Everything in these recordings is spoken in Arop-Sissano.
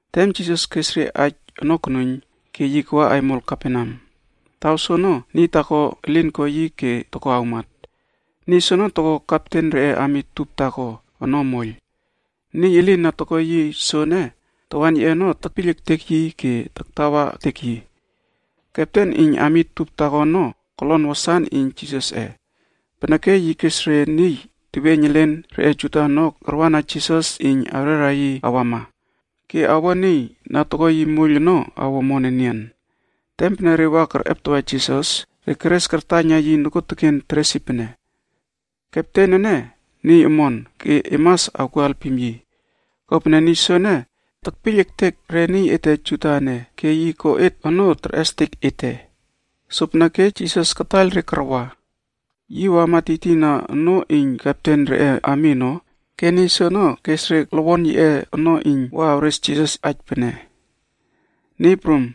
Tem Jisas kes re aij ono konuiyn ke yi kawa aimol Kaperneam. Taw soono, niy taako elin ko yi ke toko awmat. Niy soono toko kepten reꞌe ami tup taako ono moiyl. Niy elin na toko yi soene, tawan yiꞌe ono tekpiyl ektek yi ke taktawa ektek yi. Kepten iyn ami tup taako ono, kolon wasan iyn Jisasꞌe, peneke yi kes re niy teweiyn elen reꞌe Juda ono karwana Jisas iyn awrera yi awama ke awo niy na toko yi moiyl ono awo omon enian. Tem pene re wa kerꞌeptawa Jisas, re keres kartaiyna yi nokuoteken teres yi pene, “Kepten ene, niy omon ke e mas awkuo alpim yi. Kopene niy soene tekpiyl ektek re niy ete Juda ene ke yi ko et onoo terꞌestek ete.” Sopeneke Jisas kataiyl re karwa. Yi wama tiytiyna onoo iyn kepten reꞌe ami ono ke niy soono kes re lowon elen yiꞌe ono iyn wa awres Jisas aij pene, “Niy Prum,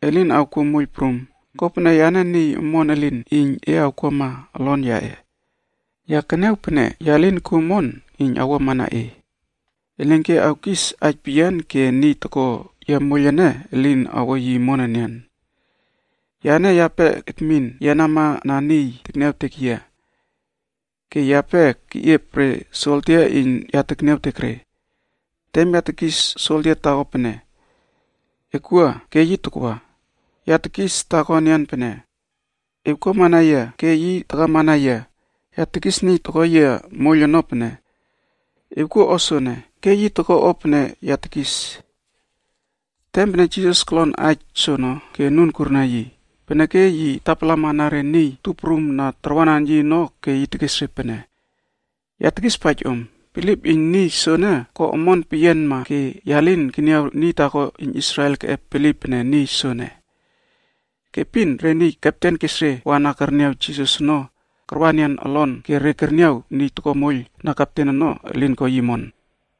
e lin awkuo moiyl prum, kopene yane niy omon elin iyn e awkuama olon yaꞌe. Ya keniaw pene ya lin kuo omon iyn awuamana e. Elinke awkis aij peyian ke niy toko yia moiyl ene elin awo yi omon enian. Yane yape ekmin yenamana niy tekniawtek yia. Ke yape keꞌiep re soldia iyn ya tekniawtek re. Tem ya tekis soldia taako pene, ‘Ekwua’ ke yi takwa. Ya tekis taako enian pene, ‘Ewkuamana yia’ ke yi takamana yia. Ya tekis niy toko yia moiyl ono pene, ‘Ewkuo o soene,’ ke yi toko o pene ya tekis.” Tem pene Jisas kolon aij soono ke anun kurna yi, peneke yi tapalamana re niy tup prum na tarwanan yi ono ke yi tekes re pene, “Ya tekispaij om, bilip iyn niy soene ko omon peyianma ke ya lin keniaw niy taako iyn Israel keꞌep bilip pene niy soene.” Ke epin re niy kepten kes re wa na kerniaw Jisas ono karwa enian olon ke re kerniaw niy toko moiyl na kepten ono, elin ko yi omon.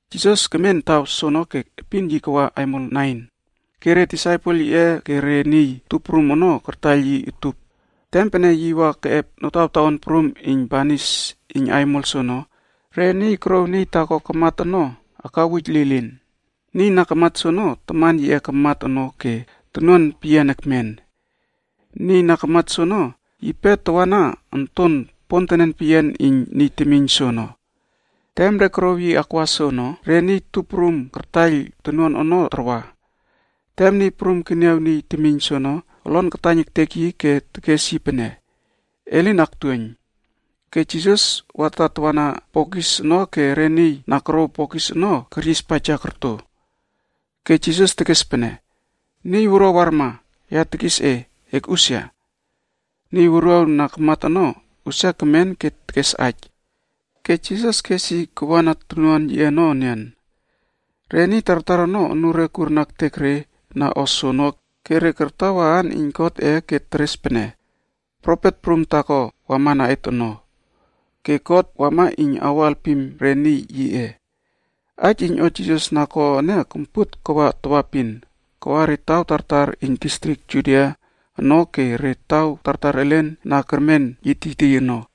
Jisas kemen taw soono ke epin yi kawa aimol Nain, ke re disaipel yiꞌe ke re niy tup prum ono kartaiyl yi utup. Tem pene yi wa keꞌep notawtaon prum iyn banis iyn aimol soono, re niy korouw niy taako kamat ono akawuj lilin. Niy na kamat soono, taman yiꞌe kamat ono ke tonuan peyian ekmen. Niy na kamat soono, yipe tawana onton pontenen peyian iyn niy temiyn soono. Tem re korouw yi akwa soono, re niy tup prum kartaiyl tonuan ono tarwa. Tem Niy Prum keniaw niy temiyn soono, olon kataiyn etek yi ke tekes yi pene, “E lin aktuoiyn.” Ke Jisas wa tatawa na bokis ono ke re niy na korouw bokis ono keryispaija korto. Ke Jisas tekes pene, “Niy wuruaw warma, ya tekis e, ekꞌusia!” Niy wuruaw na kamat ono, usia kemen ke tekes aij. Ke Jisas kes yi kawana tonuan yiꞌe ono enian. Re niy tartar ono anure kurna ektek re na o soono ke re kartawa aan iyn Godꞌe ke re teres pene, “profet prum taako wamana et ono,” ke “God wama iyn awo alpim re niy yiꞌe.” Aij iyn o Jisas na ko ene kompuot kawa tawaepin, kawa re taw tartar iyn distrik Judia ono ke re taw tartar elen na kermen yi tiytiy ono.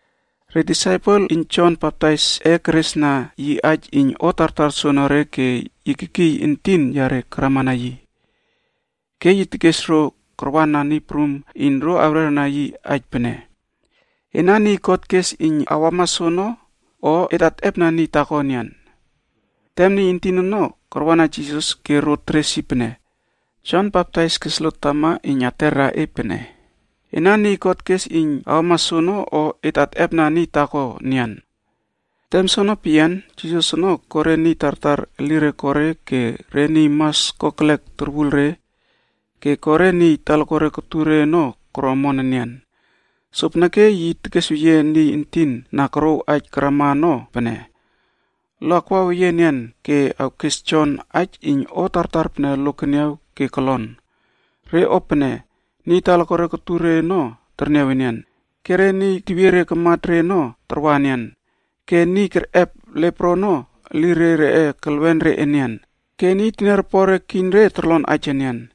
Re disaipel iyn Jon Baptaisꞌe keresna yi aija iyn o tartar soonore ke yi kekiy entin yare karamana yi. Ke yi kes ro karwana Niy Prum iyn ro awrerna yi aij pene, “Ena niy God kes iyn awama soono, o et atꞌepna niy taako enian?” Tem niy entin ono karwana Jisas ke ro teres yi pene, “Jon Baptais kes lot tama iyn aterna e pene, ‘Ena niy God kes iyn awama soono, o et atꞌepna niy taako enian?’” Tem soono peyian, Jisas ono ko re niy tartar elire ko re, ke re niy mas kokelek torwul re, ke ko re niy talakuare kotur re ono koro omon enian. Sopeneke yi tekesweyie niy entin na korouw aij karama ono pene, “Lo akwaweyie enian ke awkes Jon aij iyn o tartar pene lo keniaw ke kolon. Re o pene: niy talakuare kotur re ono terniaw enian, ke niy tewiere karmat re ono tarwa enian, ke re niy kerꞌep lepro ono elire reꞌe kelwen re enian, ke niy teniaropore kiyn re torlon aij enian,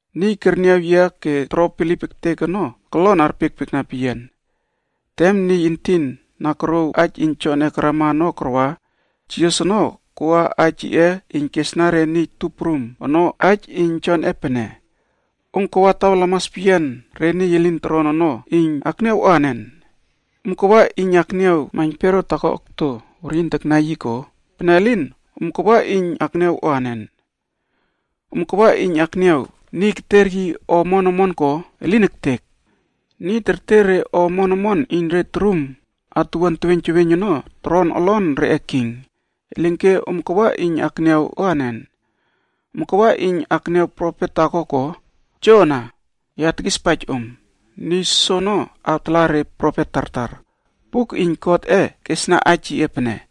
Niy kerniaw yia ke toro bilip ektek ono, kolon arpiekpiekna peyian.” Tem niy entin na korouw aij iyn Jonꞌe karama ono karwa, Jisas ono koa aij yiꞌe iyn kesna re niy tup prum ono aij iyn Jonꞌe pene, “Om kawa taw lamas peyian re niy elin toron ono iyn akniaw o anen? Om kawa iyn akniaw maiynpero taako okto weryin taknai yi ko? Pene elin, om kawa iyn akniaw o anen? Om kawa iyn akniaw niy keter yi o omon omon ko? Elin ektek! Niy terter re o omon omon iyn re torum atuwuan teweiyn teweiyn ono toron olon reꞌe king. Elinke om kawa iyn akniaw anen? Om kawa iyn akniaw profet taako ko? Joana! Ya tekispaij om, niy soono awtala re profet tartar. Buk iyn Godꞌe kesna aij yiꞌe pene,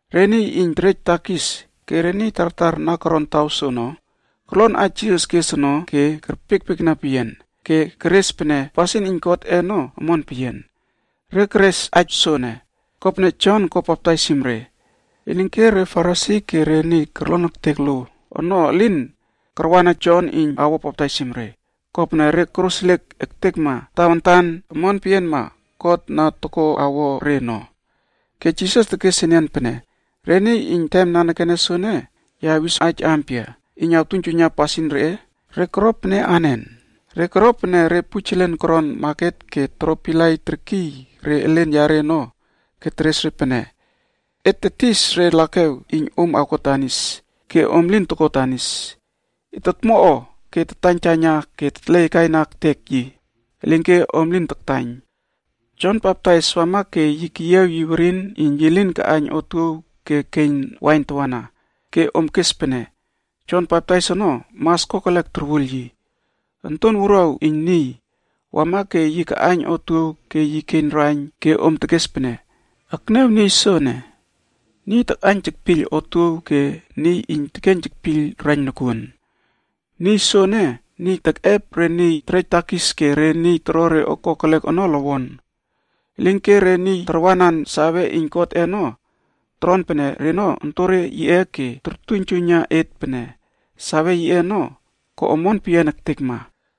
Re niy iyn terejna re temiyn wuruaw takis ono ke re niy tartar na koron taw soono, korlon aij Jisas kes ono ke kerpiekpiekna peyian ke keres pene pasin iyn Godꞌe ono omon peyian. Re keres aij soene, kopene Jon ko baptaisim re. Elinke re Farisi ke re niy korlon ektek lo ono elin karwana Jon iyn awo baptaisim re, kopene re koroseliek ektekma tawantan omon peyianma God na toko awo re ono. Ke Jisas tekes enian pene, “Re niy iyn tem nanekene soene, ya awis aij ampia iyn awtuiynjuiyna pasin reꞌe? Re koro pene anen? Re koro pene re pujelen koron maket ke toro pilai terkiy re elen yare ono ke teres re pene, ‘Et tetis re lakew iyn om awko danis ke om lin toko danis, et tomo o ke tataiytaiyna ke tetleaikaina ektek yi, elinke om lin taktaiyn.’ Jon Baptais wama ke yi keyiaw yi werin iyn yi lin kaꞌaiyn otuow ke keiyn wain tawana, ke om kes pene, ‘Jon Baptais ono, mas kokelek torwul yi.’ Onton iyn Niy, wama ke yi kaꞌaiyn otuow ke yi keiyn raiyn ke om tekes pene, ‘Ekniaw niy soono, yi takꞌaiyn tekpiyl otuow ke tekeiyn tekpiyl raiyn nokuon. Niy soene, niy iyn tekꞌep re niy iyn terejna re temiyn wuruaw takis ke re niy toro re o kokelek ono lowon.’ Elinke re niy tarwanan save iyn Godꞌe ono, toron pene reno ontonre yiꞌe ke tortuiynjuiyna et pene save yiꞌe ono ko omon peyia ektekma.”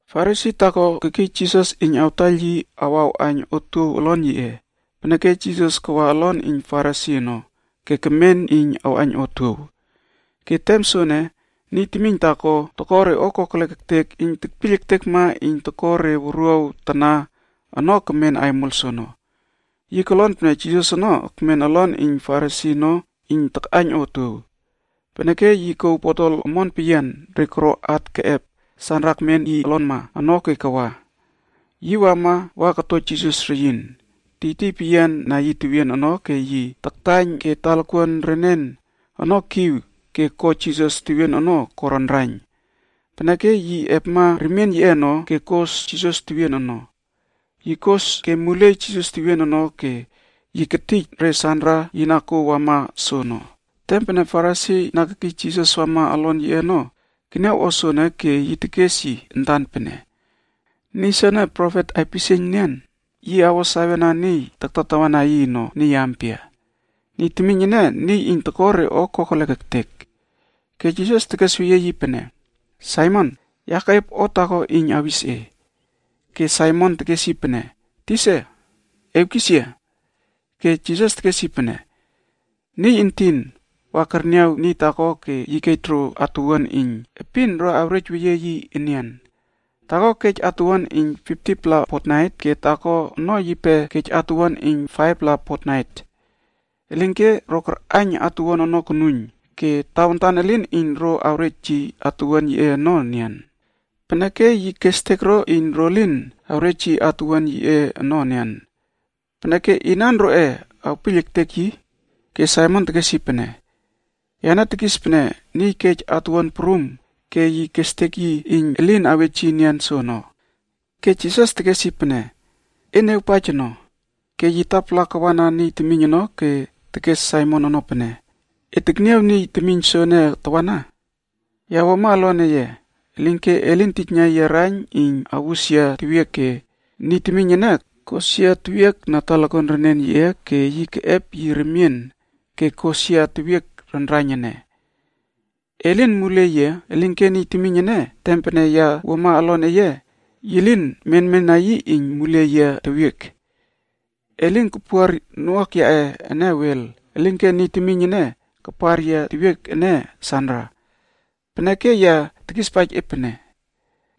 Farisi taako kekiy Jisas iyn awtaiyl yi wa arꞌaiyn otuow olon yiꞌe. Peneke Jisas kawa olon iyn Farisi ono, ke kemen iyn awꞌaiyn otuow. Ke tem soene, niy temiyn taako iyn tekpiyl ektekma pasin kokelek ektek iyn toko re wuruaw tana ono, yipe kemen aimol soono. Yi kolon pene Jisas ono ekmen olon iyn Farisi ono takꞌaiyn otuow. Peneke yi kouw botol omon peyian re koro at ke keꞌep sanra ekmen yi olonma ono ke wama. Yi wama wa koto Jisas reyin, tiytiy peyian na yi tewien ono ke yi taktaiyn ke talakuan renen ono kiw ke ko Jisas tewien ono ko raiynraiyn. Peneke yi epma remien yiꞌe ono ke kos Jisas tewien ono. Yi kos ke muliey Jisas tewien ono ke yi ketij re sanra yi na kouw wama soono. Tem pene Farisi na kekiy Jisas wama olon yiꞌe ono keniaw o soono ke yi tekes yi antan pene, “Niy soene profet aipisieiyn nian, yi awo sawena niy na taktatawa yi ono, niy ampia. Niy temiyn ene, niy toko re o kokelek.” Ke Jisas tekesweyie yi pene, “Saimon, ya keꞌiep o taako iyn awis e.” Ke Saimon tekes yi pene, “Tisa, ewkis yia.” Ke Jisas tekes yi pene, “Niy entin wa kerniaw niy taako ke yi kej ro atuwuan iyn epin ro awrejweyie yi enian. Taako kej atuwuan iyn 50-pla fotnait ke taako ono yipe kej atuwuan iyn 5-pla fotnait peyian. Elinke ro karꞌaiyn atuwuan ono konuiyn ke tawantan elin iyn ro awrej yi atuwuan yiꞌe ono enian. Peneke yi kestek ro iyn ro lin awrej yi atuwuan yiꞌe ono enian. Peneke inan roꞌe awpiyl ektek yi?” Ke Saimon tekes yi pene, “Yane tekis pene niy kej atuwuan prum ke yi kestek yi iyn elin awej yi enian soono.” Ke Jisas tekes yi pene, “E niawakpaija ono.” Ke yi tapala kawana niy temiyn ono ke tekes Saimon ono pene, “E tekniaw niy temiyn soene tawana? Ya wuama olon eye, elinke e lin tijna yia raiyn iyn awus yia tewiek ke niy temiyn ene kos yia tewiek na talakuan renen yiꞌe ke yi keꞌep yi remien ke kos yia tewiek raiynraiyn ene. E lin muliey yia, elinke niy temiyn ene, tem pene ya wuama olon eye, yi lin menmena yi iyn muliey yia tewiek. E lin kapuar noꞌuak yaꞌe ene wel, elinke niy temiyn ene kapar yia tewiek ene sanra. Peneke ya tekispaij e pene,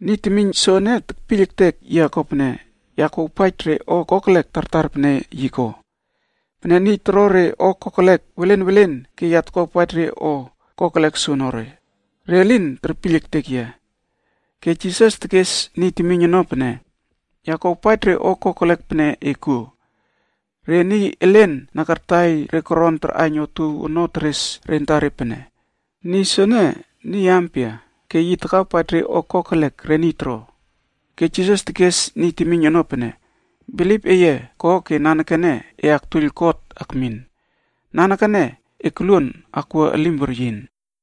niy temiyn soene tekpiyl ektek yia kopene ya kuawpaij re o kokelek tartar pene yi ko. Pene niy toro re o kokelek welen welen ke ya tokuawpaij re o kokelek soenere, re lin terpiyl ektek yia.” Ke Jisas tekes niy temiyn ono pene, “Ya kuawpaij re o kokelek pene e kuo.” Re niy elen na kartaiyl re koron tarꞌaiyn otuow ono teres re antare pene, “Niy soene niy ampia, ke yi takawpaij re o kokelek re niy toro?” Ke Jisas tekes niy temiyn ono pene, “Bilip eye ko ke nanekene e aktuoiyl God akmin. Nanekene elim ko omon ono ke e koluon akwua elim weryin.”